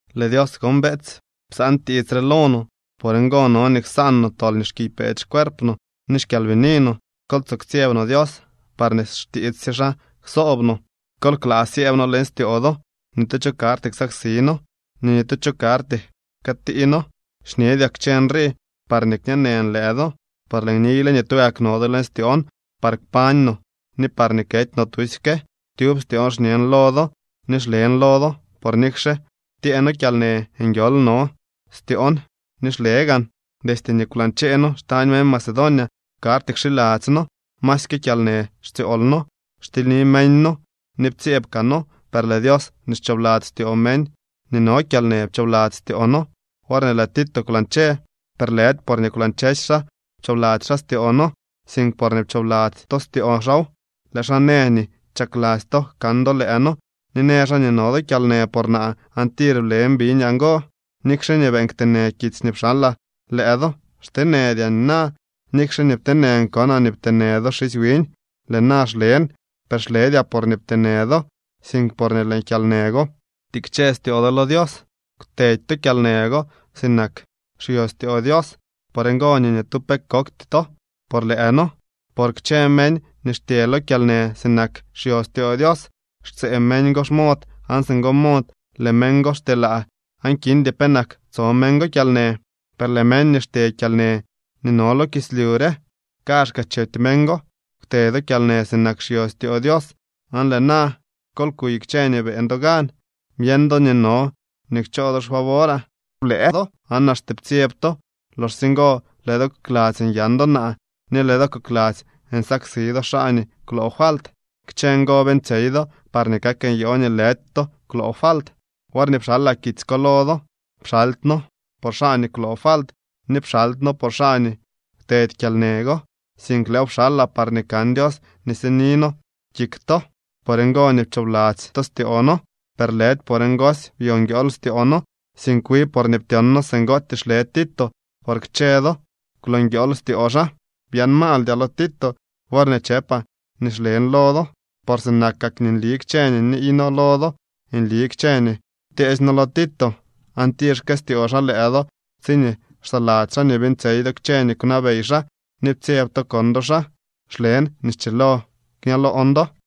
Lëë Dios gon, beetsy, psaan tiits re lo no. Por ngo no nii ksaan no tol nii xkiypeedy xcuerp no ni xkyalbini no. Kol tsoo ktsyeb no Dios parñee xtiits sye xaa ksob no. ¡Kol klaa syëëb noo leñ styoo do! Ni tu cho karty ksaksi noo, ni ni tu cho karty jkëëtii noo. Xñedyaa kchë nrii parñee kñeenën lëë do, por lëën niyle nii tugak no do leñ styoon par kpañ no ni parñee kety no tusyke. Tyub styoon xñen lo do ni xlen lo do, por nikxe ptyee noo kyalnë, nguiool no styoon ni xle gaan. Destye nii kwlañchee noo xtañ meñ Macedonia, karty kxiladzy noo, masyke kyalnë xtsyool noo. Xtilyni meñ noo ni ptsyeeb kaa noo. Per lëë Dios nii xchoobladzy styoo meñ nii no kyalnë pchoobladzy styoo noo worñee lëë Tito kwlañche. Per lëdy porñee kwlañchesy xaa pchoobladzy xaa styoo noo, sink porñee pchoobladzy to styoo xaaw. Lëë xaa në nii chakladzy to kan do lëë noo ni në xaa nii no do kyalnë por naa, aan tir blen biñaa ngo. Nikxe nii beeñ kteenë kitsy nii pxalaa lëë do, xteenëdyaa nina. Nikxe nii pteenën konaa nii pteenë do xisy wiñ, lëë na xlen. Per xledyaa porñee pteenë do, sink porñee lëë kyalnë go ptikche styoo do lo Dios. Kwtedy to kyalnë go sinak xyo styoo Dios. Por ngo nii ni tu pe kokty to por lëë noo. Por kchë meñ nii xtye lo kyalnë sinak xyo styoo Dios, xtsëë meñ go xmod aan singo mod lëë meñ go xtyelaa aan kindy penak tso meñ go kyalnë. Per lëë meñ nii xtyee kyalnë nii no lo kislyu re, kaazhkaa chety meñ go. Kwte do kyalnë sinak xyo styoo Dios, aan lëë na ¡kol kuy kchë nii beeñ do gan! Byeñ do nii no nii kchoo do xfavoraa. Blëë do aan axte ptsyeb to. Loxsye ngo lëë do kokladzy nyan do naa ni lëë do kokladzy nsaksi do xaa nii kwloo falt. Kchë ngo beeñtsyey do parñee kak nyoo nii lëdy to kwloo falt. Worñee pxalaa kitsy ko lo do, pxaldyno por xaa nii kwloo falt, ni pxaldyno por xaa nii kwtedy kyalnë go, sink lëëw pxalaa parñee kan Dios nii sini noo kik to. Por ngo nii pchoobladzy to styoo noo. Per lëdy por ngosy byo nguiool styoo noo, sink wi porñee ptyon noo singootyee xle Tito, por kchë do kwloo nguiool styoo xaa. Byaan maaldyaa lo Tito worñee chëpaa nii xlen lo do. Por sinakak nii nli kchë nii niiy noo lo do, nli kchë nii ptyeesy noo lo Tito. Aan tir xkëstyoo xaa lëë do tsiñee xsaladzy xaa nii beeñtsyey do kchë nii kwnabey xaa ni ptsyeb to kon do xaa. Xlen nii schilo kña loon do.